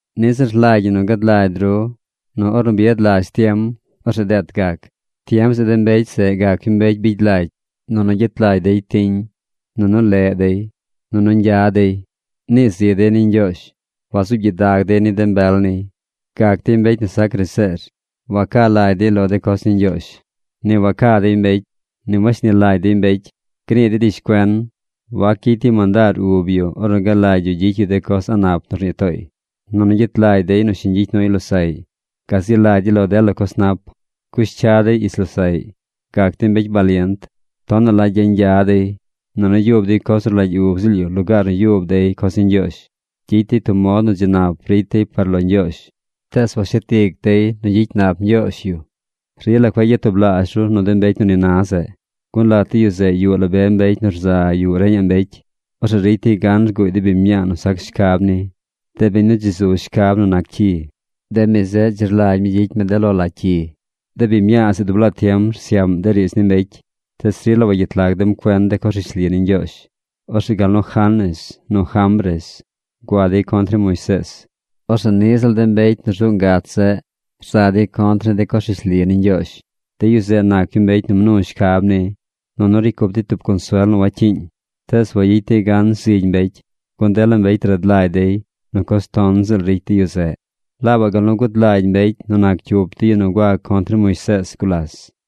Niꞌ ziꞌl rlagy ñi nu gad lagy ru nu ornu bi yad lazh tiem, orzeꞌ deet gac. Tiem zeꞌ de mbecy zeꞌ gac yu mbecy bigy lagy. Nunu gyet lagy dey tiñ. Nunu leꞌ dey. Nunu ñgya dey. Nii zi dey ni Ñgyoozh. Wazuub gyidag dey ni de mbel niy. Gac dey mbecy nu sac graseer. Waca lagy yu lo de coz ni Ñgyoozh. Ni waca dey mbecy, ni washni lagy dey mbecy. Gnii dey rishcuen. Wac gyicy dey mandaar ub yu ornu galagy yu gyicy yu de coz a̱ꞌ nap nu rnii tooy. Nunu gyet lagy dey nu shiñ gyicy nuy losaꞌy. Gazi lagy dey lo dela coz nap. Cush cya dey ich losaꞌy. Gac dey mbecy balient. Tonaꞌ la gyañgya dey. Nunu yub dey coz nu rlagy ub ziꞌl yu lugaar nu yub dey coz ni Ñgyoozh. Gyicy dey tub mod nu dzi nap ricy dey par lo Ñgyoozh, tees washet ic dey nu gyicy nap Ñgyoozh yu. Rila cueꞌ gyatublaazh ru nu de mbecy nu ni na zeꞌ. Gun lat de yu zeꞌ yuꞌ la be mbecy nu rza yuꞌ reñaꞌ mbecy. Orzeꞌ ricy dey gan rguuy de biñ mñaa nu sac shcab ni, de biñ nu dzi rzu shcab nu nac cyi. De mi zeꞌ dzi rlagy mi gyicy mi de lo la cyi. De biñ mñaa zeꞌ dub laa tiem rsyaꞌm de riidz ni mbecy, tees rila wagyet lag dem cuen de coz rishli ni Ñgyoozh. Orzeꞌ gal nu Janes nu Jambres gua dey contr ni Moisees, orzeꞌ niꞌ ziꞌl de mbecy nu rzuꞌ ngach zeꞌ rza dey contr ni de coz rishli ni Ñgyoozh. De yu zeꞌ nac yu mbecy nu mnu shcab ni. Nunu ricy cup dey tub consuel nu wacyiiñ. Tees wayicy dey gan zigy mbecy, gun dela mbecy rad lagy dey nu coz ton ziꞌl ricy de yu zeꞌ, laabaꞌ gal nu gud lagy mbecy nu nac cyup de yu nu gua contr ni Moisees gulas.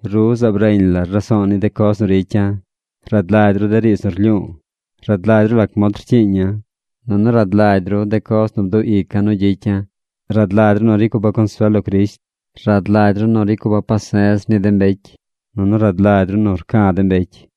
Ru zaab reñ lar raso̱o̱ ni de coz nu ricya̱. Rad lagy ru de riidz nu rlyu̱u̱. Rad lagy ru lac mod rcyiiña̱. Nunu rad lagy ru de coz nu bduꞌ ica̱ nu gyicya̱. Rad lagy ru nu ricy cupa̱ consuel lo Crisht. Rad lagy ru nu ricy cupa̱ pase̱z ni de mbecy. Nunu rad lagy ru nu rca̱ de mbecy.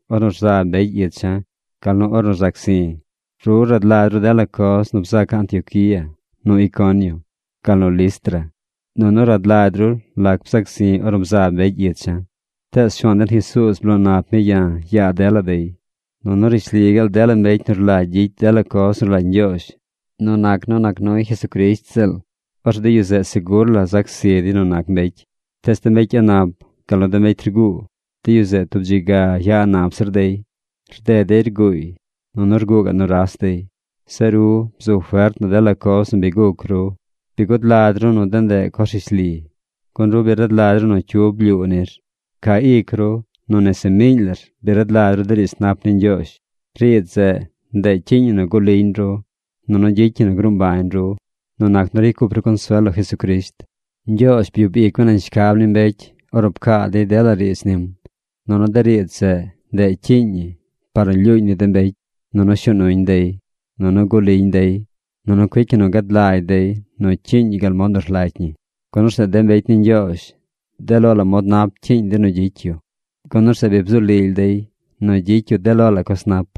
ornu rzab mbecy icha̱ gal nu ornu rzac zi̱. Ru rad lagy ru dela coz nu bzaca̱ Antioquía, nu Iconio, gal nu Listra. Nunu rad lagy ru lac bzac zi̱ ornu bzab mbecy icha̱. Tees Shuaan den Jesuuz bloo nap mi ya̱ yaa dela dey. Nunu rishli gaal dela mbecy nu rlagy gyicy dela coz nu rlagy Ñgyoozh nu nac nu nac nuy Jesucrisht ziꞌl, orzeꞌ de yu zeꞌ segur la zac zi dey nu nac mbecy. Tees de mbecy a̱ꞌ nap gal nu de mbecy rguu, de yu zeꞌ tub dzi ga ya a̱ꞌ nap zir dey. Rded dey rguuy. Nunu rguu gaꞌ nuras dey. Zeꞌ ru, bzu fert nu dela coz nu bi guc ru. Bi gud lagy ru nu de ndeꞌ coz rishli. Gun ru bi rad lagy ru nu cyu blyuu nir. Ca ic ru nu nese miiñ lar bi rad lagy ru de riidz nap ni Ñgyoozh. Riidz zeꞌ, ndeꞌ cyiiñ ñi nu guꞌ liñ ru, nunu gyicy ñi nu gruu mbañ ru nu nac nu ricy cup ru consuel lo Jesucrisht. Ñgyoozh byub ic mi nañ shcab ni mbecy ornu pcaa dey dela riidz nim. Nunu de riidz zeꞌ, ndeꞌ cyiiñ ñi par nu lyuuñ ni de mbecy, nunu shuu nuñ dey, nunu guꞌ liñ dey, nunu cuic ñi nu gad lagy dey nu cyiiñ yu gal mod nu rlagy ñi. Gun orzeꞌ de mbecy ni Ñgyoozh de lo la mod nap cyiiñ dey nu gyicy yu. Gun orzeꞌ bi bzu lily dey nu gyicy yu de lo la coz nap.